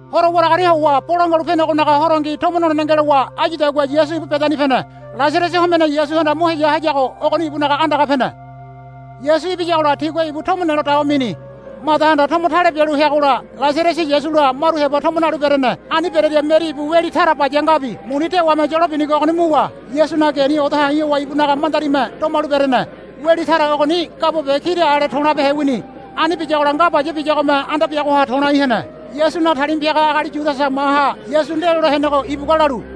Horo waragaria howa Bolangua Halu Penegonaga Horongi tomo nolene ngelowa áyudagua Yasu ibu Bedani pene. Lasarasi homene Yasuhanda mo heya hayago ogoni ibunaga andaga pene. Yasu ibiyagola tigua ibu tomo nelo dawa mini. Madahanda tomo tale bialu heagola Lasarasi Yasula maru heba tomo nalu berene. Ani berearia Meri ibu weli tara baya ngabi muni dewame yolo binigo ogoni muwa Yasunaga geni odo ha̱i̱ howa ibunaga mandarime domalu berene. Weli tara ogoni gabo be kira ale to̱labehe wini. Ani biyagola nga baya biyagome anda biagoha to̱lai hene. Yasunaga talima piaga agali Yudasa maha Yasu ndelole henego ibugua lalu,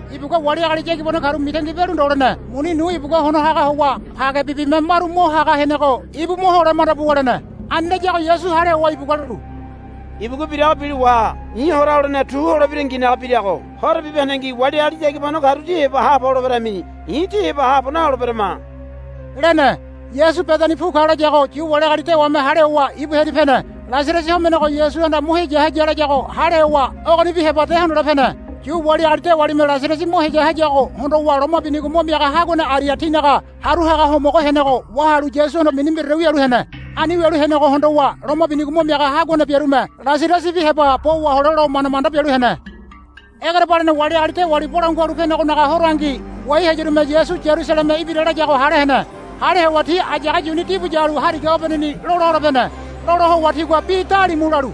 Ibugua wali agali yagibano karu mitangi bialu ndo lene. Muni nu ibugua hono haga howa pagebibime maru mo haga henego ibu mo hole manda buwa lene. Ani layago Yasu hale howa ibugua lalu, Ibugua birago bilo waha. I̱ hora holene tu holebiranginaga birago. Horo bibahendengi wali agali yagibanoru tí heba haabo holeberami. I̱ tí heba haabo naholeberama, lene. Yasu Bedani pu ka layago Yu wali agali dewame hale howa ibu hearia pene. Lasarasi homenego Yasuhanda mo heya haya layago hale howa ogonibi heba de hondole pene. Yu wali agali dewalime Lasarasi mo heya hayago hondowa loma binigo mo miaga haguane aria tinaga haru haga homogo henego wahalu Yasuhondo mini mbiraore wialu hene. Ani wialu henego hondowa loma binigo mo miaga haguane biarume Lasarasibi heba bo wahole lo manda manda bialu hene. Egerebalene wali agali dewali Bolangua Halu Penegonaga Horongi ngoai hayarume Yasu Yarusaleme ibira layago hale hene. Hale howa ti ayage yuni dibu yalu hariga obeneni lola hole pene. Lola howa tigua bi dalimu lalu,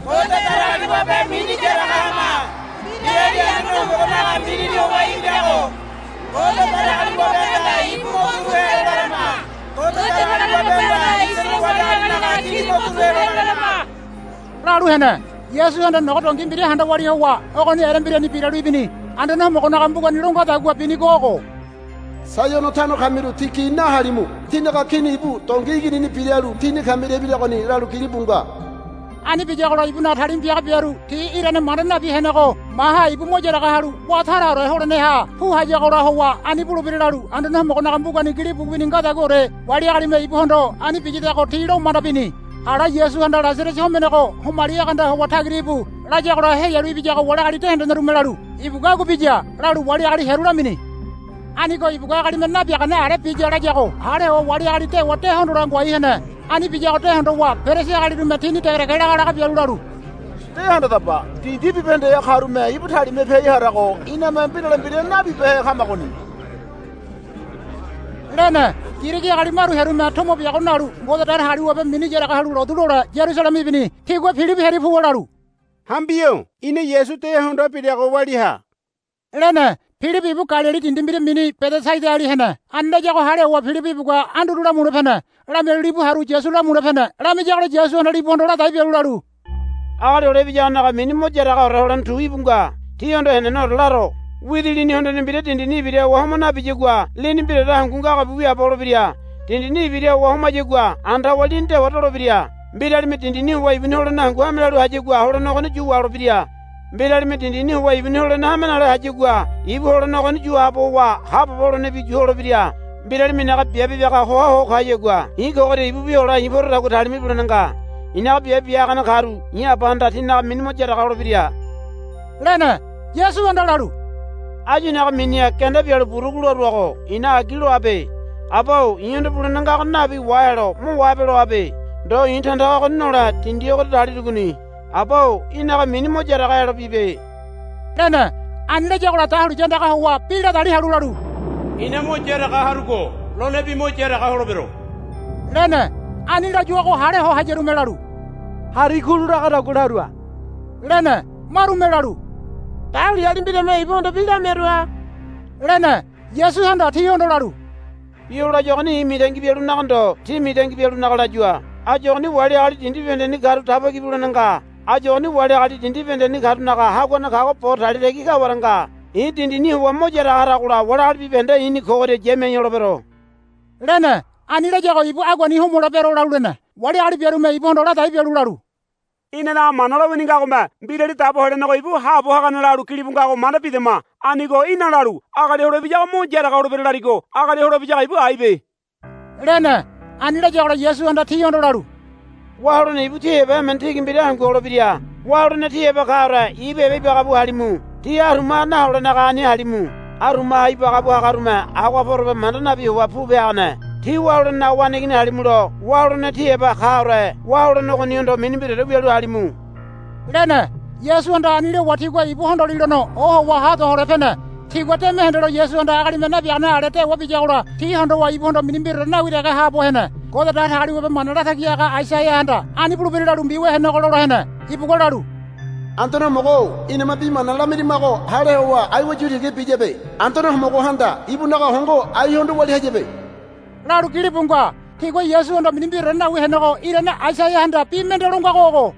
Ngode Datagaliwabe mini yaraga hama. Mbirali Anduane Homogonaga minini howa ibirago Ngode Datagaliwabehanda ibu mo turu helo larama. Ngode Datagaliwabehanda Isaraele wali agalinaga Kini mo turu helo larama, lalu hene. Yasuhanda nogo dongi mbira handa walia howa ogoni erembirani biralu ibini. Anduane Homogonaga mbugani lo ngadagua binigo ogo, Saiono tano kamiru tí gi nahalimu. Tínaga kini ibu dongi iginini biralu tíni kamiria ibiragoni, lalu gilibu nga. Ani biyagola ibunaga talima piaga biaru ti irane manda nabi henego maha ibu mo yaraga halu wá taraore holeneha pu hayagola howa ani bulebira lalu Anduane Homogonaga mbugani gilibu wini ngadaguaore wali agalime ibuhondo ani biyadago ti lo manda bini. Ala Yasuhanda Lasarasi homenego, Homali egeanda howa tagira íbu, layagola heyalu ibiyago wali agali de hendenerume lalu, Ibugua agua biya, lalu wali agali hearu lamini. Anigo ibugua agalime nabiagane ale biya layago hale howa wali agali dewa de hondole ngoai hene. Ani biyago de hondowa Perisi agalirume tini degedege lagalaga bialu lalu, De handadaba. Dindi bibahendeha karume ibu talima piai harago iname mbirale mbira nabibehe kamagoni, lene. Girigi agali maru hearume tomo biago nalu Ngode Datagaliwabe mini yaraga halu lotu lole Yarusaleme ibini. Tigua Pilibi hearia puwa lalu, Hambi-o ina Yasu de hondoa birago walia ha, lene. Pilibi ibu Galili dindi mbira mini Bedesaidali hene. Ani layago hale howa Pilibi ibugua Anduru lamule pene. Lamialu libu haru Yasu lamule pene. Lamiyagola Yasuhanda libuhondo ladai bialu lalu, Agali Hole Ibiyagonaga mini mo yaragaore holene tu íbu nga. Tíhondo heneneore laro. Widi lini hondene mbira dindini ibira howa homa nabiyagua lini mbiraore hangu ngagobi wiaabo holebira. Dindini ibira howa homayagua anda howa lini dewa dolebira. Mbiralime dindini howa ibuni holene hangu hame lalu hayagua holene ogoni yu waholebira. Mbiralime dindini howa ibuni holene hame nale hayagua ibu holene ogoni yu haabo howa haabobo holenebi yu holebira. Mbiralime i̱naga biabe bia hoa ho kayagua i̱ kogoria ibubi hole i̱ porodagua talima ibulene nga. I̱naga biabe bia hagane karu i̱ Abahanda tinaga mini mo yaraga holebira, lene. Yasuhanda lalu, Áyu i̱naga miniha genda bialu burugu laruago i̱na agi loabe. Aba-o i̱hondo bulene ngago nabi wahelo mo wahabe loabe. Ndo i̱ tandaga ogoni nole dindi ogoria dalirugoni. Aba-o í̠naga mini mo yaraga helo bibe, lene. Ani layagola dahuliya andaga howa bi ladali halu lalu, I̱na mo yaraga harugo lonebi mo yaraga holebero, lene. Ani layuago hale ho hayarume lalu, Hari kulu lagadagua larua, lene. Marume lalu, Dahuliyali mbirame ibuhondo bi lamiarua, lene. Yasuhanda tihondo lalu, Bi o layuagoni i̱ mitangi bialunaga ndo tí mitangi bialunaga layua. Áyu ogoni wali agali dindi bibahendeni karu daba ki bulene nga. Áyu ogoni wali agali dindi bibahendeni karunaga haguane kago bo talia tagi kaware nga. I̱ dindini howa mo yaraga haragola wali agali bibahende i̱ni kogoria yamiai holebero, lene. Ani layago ibu aguani homolebero lalu lene. Wali agali biarume ibuhondo ladai bialu lalu, Inanaga Mana lowini ngagome Mbirali Dabo Helenego ibu haabo hagane lalu gilibu ngago manda bidama. Anigo í̠na lalu, Agali Hole Ibiyago mo yaraga holebira, larigo Agali Hole Ibiyago ibu aibe, lene. Ani layagola Yasuhanda tihondo lalu, Wá holene ibu tí heba emene tigi mbira hangu holebira. Wá holene tí heba kaore ibu heba ibagabu halimu. Tí arumaha naholenaga ani halimu. Arumaha ibagabu hagarume agoha porobe manda nabi howa pupe hagane. Tí wá holenenaga waneigini halimulo wá holene tí heba kaore wá holene ogonihondo mini mbiraore wialu halimu, lene. Yasuhanda ani lowa tigua ibu hondolilono ohowa ha do hole pene. Tigua deme hendelo Yasuhanda agalime nabiagane ale dewa biyagola ti hondowa ibuhondo mini mbiraore nawi dege haabo hene. Ngode Datagaliwabe mana latagi haga Aisaiahanda ani bulebira lalu mbiwia henego lola hene. Ibugua lalu, Anduane Homogo-o iname bi mana lamirimago hale howa aiwa yu tiga biyabe. Anduane Homogohanda ibunaga hongo aihondo walia hayabe, lalu gilibu nga. Tigua Yasuhondo mini mbiraore nawi henego irane Aisaiahanda bi mende lo ngago ogo,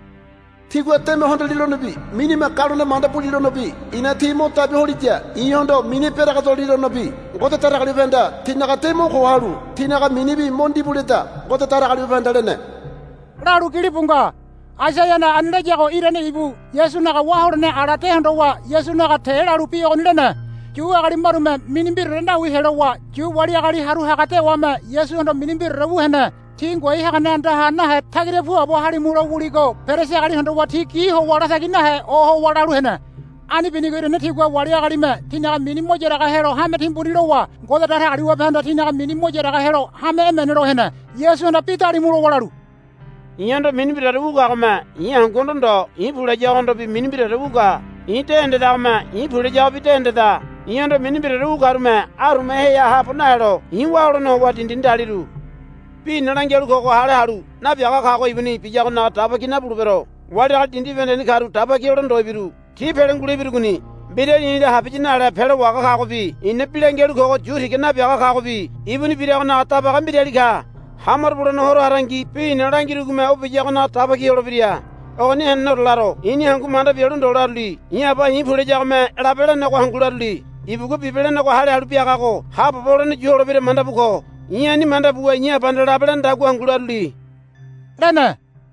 Tigua deme hondolilonobi minime galone manda bulilonobi i̱na ti mo dabi holiya i̱hondo mini beregedolilonobi Ngode Datagaliwabehanda tinaga de mo ko halu tinaga minibi mo ndibu leda, Ngode Datagaliwabehanda lene, lalu gilibu nga. Aisaiahanda ani layago irane ibu Yasunaga wá holene ala de hondowa Yasunaga te lalu bi ogoni lene. Yu agali marume mini mbiraore nawi helowa Yu wali agali haru haga dewame Yasuhondo mini mbiraore wu hene. Ti ngoai hagane andaha nahe tagira puabo halimu lo wuligo Perisi agali hondowa ti gi howa latagi nahe ohowa lalu hene. Ani binigo irane tigua wali agalime tinaga mini mo yaraga helo hame timbuni lowa Ngode Datagaliwabehanda tinaga mini mo yaraga helo hame emene lo hene. Yasuhanda bi dalimu lowa lalu, I̱hondo mini mbiraore wu kagome i̱ hanguhondo ndo i̱ pu layagohondobi mini mbiraore wu ka. I̱ de hendedagome i̱ pu layagobi de hendeda. I̱hondo mini mbiraore wu karume arumaheha haabo nahelo i̱ wá holene howa dindini daliru. Bi i̱na langialu kogo hale halu nabiaga kago ibuni biyagonaga daba ki nabulebero. Wali agali dindi bibahendeni karu daba ki hole ndo ibiru. Ti pele ngule ibirugoni. Mbirali i̱la habiya nale pelo wahaga kagobi i̱na bi langialu kogo yu tiga nabi kagobi ibuni biragonaga dabaga mbirali ka. Ha maro bulene horo harangi bi i̱na langirugome o biyagonaga daba ki holebira. Ogoni heneneore laro. I̱ni hangu manda bialu ndo laruli. I̱ Aba i̱ pu layagome labe lenego hangu laruli. Ibugua bibe lenego hale halu biagago haabobo holene yulebira manda bu ko. I̱ ani manda buwa i̱ Abahanda labe lenedagua hangu laruli, lene.